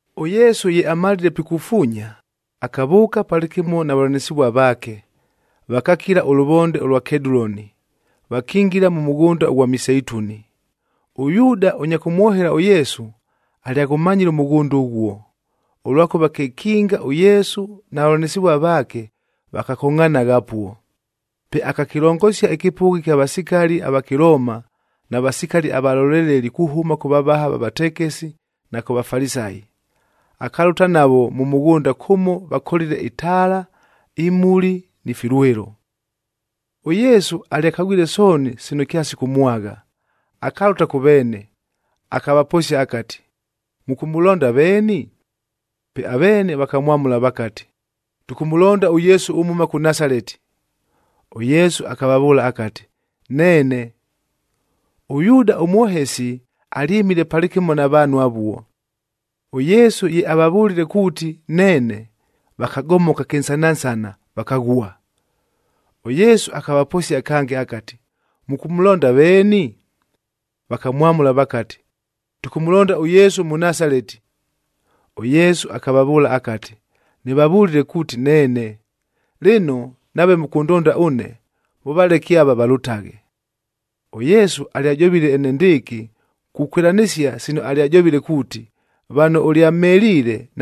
ɄYesu ye amalile pikufuunya, akavʉʉka palɨkɨmo na vavʉlanɨsɨvua vaake, vakakila ʉlʉvonde ʉlwa Keduloni, vakingila mʉ mʉghʉnda ʉghwa miseituni. ɄYuuda ʉnya kʉmwohela ʉYesu, alyaghʉmanyile ʉmʉghʉnda ʉghuo, ʉlwakʉva kekinga ʉYesu na vavʉlanɨsɨvua vaake vakakongʼhanagha apuo. Pe akakɨlongosia ɨkɨpʉgha ɨkya vasikali ava Kɨlooma na vasikali avaloleleli kuhʉma kʉ vavaha va vatekesi na kʉ Vafalisayi, akalʉta navo mʉ mʉghʉnda kʉmo vakolile itaala, imuli ni filwɨlo. ɄYesu alyakagwile sooni sino kyasikʉmwagha, akalʉta kʉ veene, akavaposia akati, “Mʉkʉmʉlonda veeni?” Pe aveene vakamwamʉla vakati, “Tʉkʉmʉlonda ʉYesu ʉmhʉma kʉ Nasaleti.” ɄYesu akavavʉʉla akati, “Neene.” ɄYuuda ʉmwohesi alyɨmile palɨkɨmo na vaanhu avuo. ɄYesu ye avavʉlile kuuti, “Neene,” vakagomoka kɨnsanansana, vakaghua. ɄYesu akavaposia kange akati, “Mʉkʉmʉlonda veeni?” Vakamwamʉla vakati, “Tʉkʉmʉlonda ʉYesu ʉMʉnasaleti.” ɄYesu akavavʉʉla akati, “Nɨvavʉlile kuuti neene. Lɨno, nave mʉkʉndonda ʉne, mʉvaleke ava valʉtaghe.” ɄYesu alyajovile enendɨɨkɨ kukwɨlanɨsia sino alyajovile kuuti, “Vano ʉlyamheliile,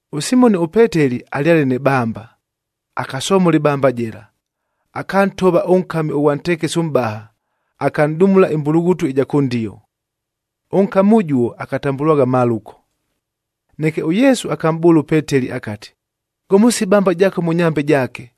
ɄSimoni ʉPeteli alyale nɨ bamba, akasomola ɨbamba jɨla, akantova ʉnkami ʉghwa ntekesi ʉmʼbaha, akanʼdumula ɨmbulughutu ɨja kʉndio. Ʉnkami ʉjuo akatambʉlwagha Maluko. Neke ʉYesu akamʼbʉʉla ʉPeteli akati, “Gomosia ɨbamba jaako mʉ nyambe jaake.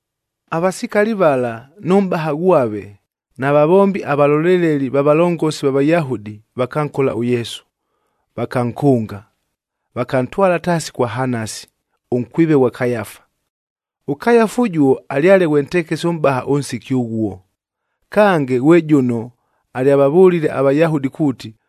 Avasikali vala nʉ mʼbaha ghwave na vavombi avaloleleli va valongosi va Vayahudi vakankola ʉYesu, vakankʉnga. Vakantwala taasi kwa Hanasi, ʉnkwive ghwa Kayafa. ɄKayafa ʉjuo alyale ghwe ntekesi ʉmʼbaha ʉnsiki ʉghuo. Kange, ghwe jʉno alyavavʉlile aVayahudi kuuti,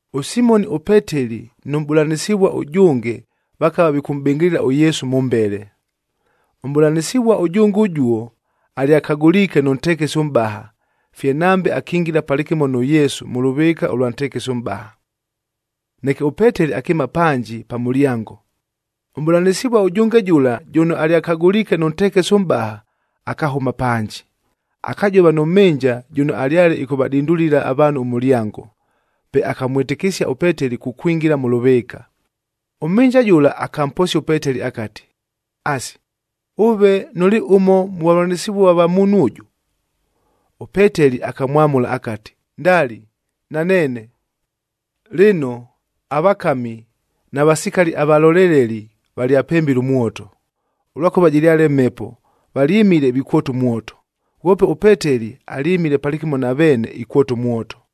ɄSimoni ʉPeteli nʉ mʼbʉlanɨsɨvua ʉjʉnge vakava vikʉmʼbɨngɨlɨla ʉYesu mʉmbele. Ʉmʼbʉlanɨsɨvua ʉjʉnge ʉjuo, alyakagʉliike nʉ ntekesi ʉmʼbaha, fye nambe akingila palɨkɨmo nʉ Yesu mʉ lʉvɨɨka ʉlwa ntekesi ʉmʼbaha. Neke ʉPeteli akɨɨma panji pa mʉlyango. Ʉmʼbʉlanɨsɨvua ʉjʉnge jʉla jʉno alyakagʉliike nʉ ntekesi ʉmʼbaha, akahʉma panji, akajova nʉ mhɨnja jʉno alyale ɨkʉvadindulila avaanhu ʉmʉlyango, pe akamwɨtɨkɨsia ʉPeteli kukwingila mʉ lʉvɨɨka. Ʉmhɨnja jʉla akamposia ʉPeteli akati, “Asi, ʉve nʉlɨ ʉmo mʉ vavʉlanɨsɨvua va muunhu ʉjʉ?” ɄPeteli akamwamʉla akati, “Ndali, naneene.” Lɨno, avakami na vasikali avaloleleli valyapembile ʉmwoto, ʉlwakʉva jɨlyale mhepo, valyɨmile vikwota ʉmwoto. Ghwope ʉPeteli alyɨmile palɨkɨmo na veene ikwota ʉmwoto.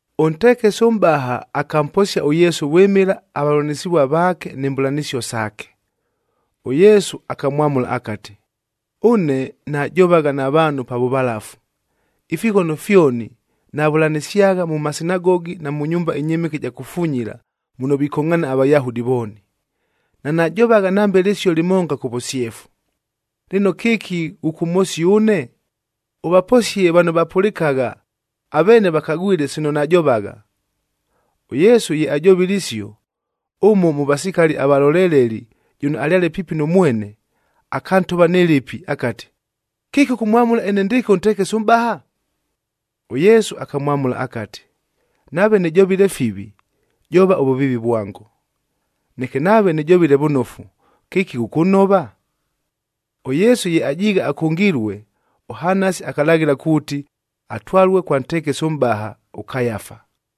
Ʉntekesi ʉmʼbaha akamposia ʉYesu vwɨmɨla avavʉlanɨsɨvua vaake ni mbʉlanɨsio saake. ɄYesu akamwamʉla akati, “Ʉne najovagha na vaanhu pa vʉvalafu, ifighono fyoni navʉlanɨsyagha mʉ masinagogi na mʉ nyumba ɨnyɨmɨke ɨja kufunyila, muno vikongʼhaana aVayahudi vooni. Nanajovagha nambe lɨsio lɨmonga kʉ vʉsyefu. Lɨno, kɨki ghʉkʉmhosia ʉne? Ʉvaposie vano vapʉlɨkagha, aveene vakagwile sino najovagha.” ɄYesu ye ajovile isio, ʉmo mʉ vasikali avalolelelid jʉno alyale piipi nʉ mwene, akantova nɨ lɨpɨ akati, “Kɨki ʉkʉmwamʉla enendɨɨkɨ ʉntekesi ʉmʼbaha?” ɄYesu akamwamʉla akati, “Nave nɨjovile fivi, jova ʉvʉviivi vwango. Neke nave nɨjovile vʉnofu kɨki ghʉkʉnhova?” ɄYesu ye ajiighe akʉngilue, ʉHanasi akalaghɨla kuuti atwalue kwa ntekesi ʉmʼbaha, ʉKayafa.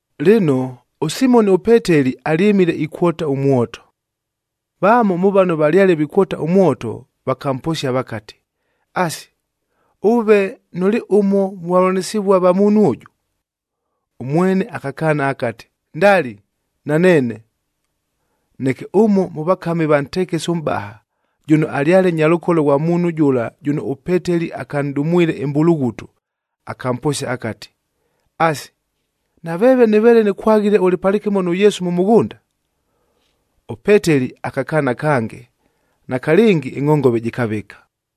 Lɨno, ʉSimoni ʉPeteli alyɨmile ikwota ʉmwoto. Vamo mʉ vano valyale vikwota ʉmwoto vakamposia vakati, “Asi, ʉve nʉlɨ ʉmo mʉ vavʉlanɨsɨvua va muunhu ʉjʉ?” Ʉmwene akakaana akati, “Ndali, naneene.” Neke ʉmo mʉ vakami va ntekesi ʉmʼbaha, jʉno alyale nyalʉkolo ghwa muunhu jʉla jʉno ʉPeteli akanʼdumwile ɨmbulughutu, akamposia akati, “Asi, naveeve nɨveele nɨkwaghile ʉlɨ palɨkɨmo nʉ Yesu mʉ mʉghʉnda?” ɄPeteli akakaana kange, nakalɨngi ɨngʼhongove jɨkavɨka.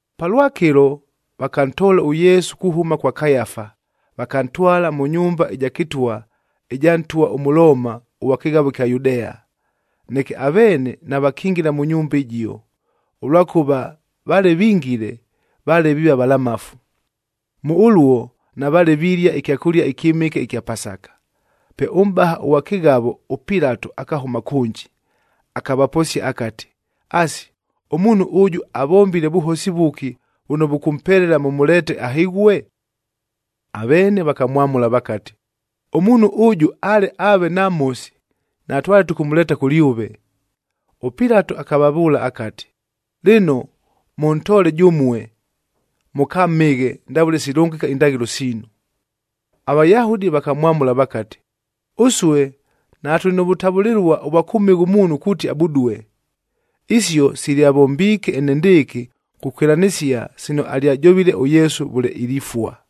Palwakɨlo, vakantoola ʉYesu kuhʉma kwa Kayafa, vakantwala mʉ nyumba ɨja kɨtwa ɨja ntwa ʉMʉlooma ʉghwa kɨghavo ɨkya Yudea. Neke aveene navakingila mʉ nyumba ɨjio, ʉlwakʉva vale vingile, vale viiva valamafu.e Mʉ ʉluo navaale vilia ɨkyakʉlia ɨkyɨmɨke ɨkya Pasaka. Pe ʉmʼbaha ʉghwa kɨghavo ʉPilato akahʉma kʉnji, akavaposia akati, “Asi, ʉmuunhu ʉjʉ avombile vʉhosi vʉki vʉno vʉkʉmpelela mʉmʉleete ahɨghue?” Aveene vakamwamʉla vakati, “Ʉmuunhu ʉjʉ ale aave namhosi, natwale tʉkʉmʉleeta kʉlyʉve.” ɄPilato akavavʉʉla akati, “Lɨno, mʉntoole jʉmue, mʉkamhɨghe ndavʉle silʉngɨka indaghɨlo siinu.” AVayahudi vakamwamʉla vakati, “Ʉsue natʉlɨ nʉ vʉtavʉlɨlua ʉvwa kʉmhɨgha ʉmuunhu kuuti abudue.” Isio silyavombiike enendɨɨkɨ kukwɨlanɨsia sino alyajovile ʉYesu vʉle ilifua.f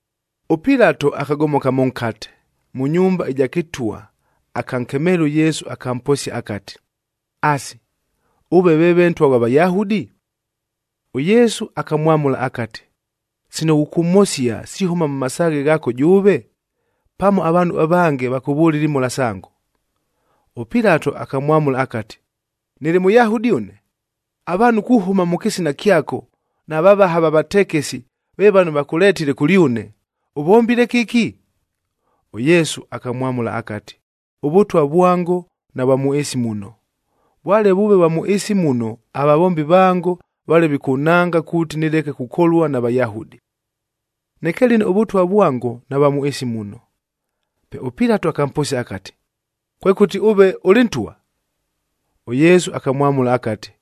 ɄPilato akagomoka mʉnkate, mʉ nyumba ɨja kɨtwa, akankemeela ʉYesu akamposia akati, “Asi, ʉve veeve Ntwa ghwa Vayahudi?” ɄYesu akamwamʉla akati, “Sino ghʉkʉmhosia, sihʉma mʉ masaaghe ghaako jʉʉve? Pamo avaanhu avange vakʉvʉlile imhola sango?” ɄPilato akamwamʉla akati, “Nɨlɨ Mʉyahudi ʉne? Avaanhu kuhʉma mʉ kɨsina kyako, na vavaha va vatekesi ve vano vakʉletile kʉlyʉne. Ʉvombile kɨki?” ɄYesu akamwamʉla akati, “ɄVʉtwa vwango navwa mʉ ɨɨsi muno, vwale vʉʉve vwa mʉ ɨɨsi muno avavombi vango vale vikʉnhanga kuuti nɨleke kukolua na Vayahudi. Neke lɨno ʉVʉtwa vwango navwa mʉ ɨɨsi muno.” Pe ʉPilato akamposia akati, “Kwekʉti ʉve ʉlɨ ntwa?” ɄYesu akamwamʉla akati,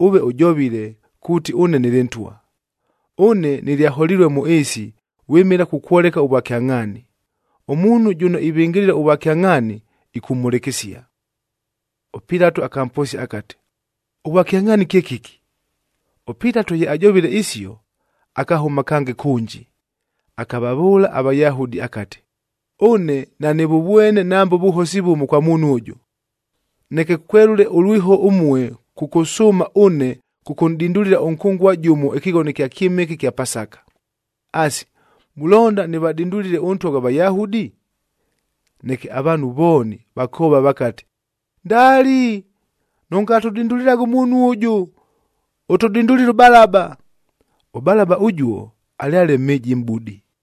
“Ʉve ʉjovile, kuuti ʉne nɨlɨ ntwa. Ʉne nɨlyaholilue mʉ ɨɨsi vwɨmɨla kukwoleka ʉvwakyangʼhaani. Ʉmuunhu jʉno ivɨngɨlɨla ʉvwakyangʼhaani, ɨkʉmhʉlɨkɨsia.” ɄPilato akamposia akati, “Ʉvwakyangʼhaani kye kɨki?” ɄPilato ye ajovile isio, akahʉma kange kʉnji, akavavʉʉla aVayahudi akati, “Ʉne nanɨvʉvwene nambe ʉvʉhosi vʉmo kwa muunhu ʉjʉ. Neke kwelʉle ʉlwiho ʉmue kʉkʉsʉʉma ʉne kʉkʉnʼdindulila ʉnkʉngua jʉmo ɨkɨghono ɨkya kyɨmɨke kya Pasaka. Asi, mulonda nɨvadindulile ʉNtwa ghwa Vayahudi?” Neke avaanhu vooni vakoova vakati, “Ndali! Nʉngatʉdindulilaghe ʉmuunhu ʉjʉ, ʉtʉdindulile ʉBalaba.” ɄBalaba ʉjuo, alyale mhɨjimʼbudi.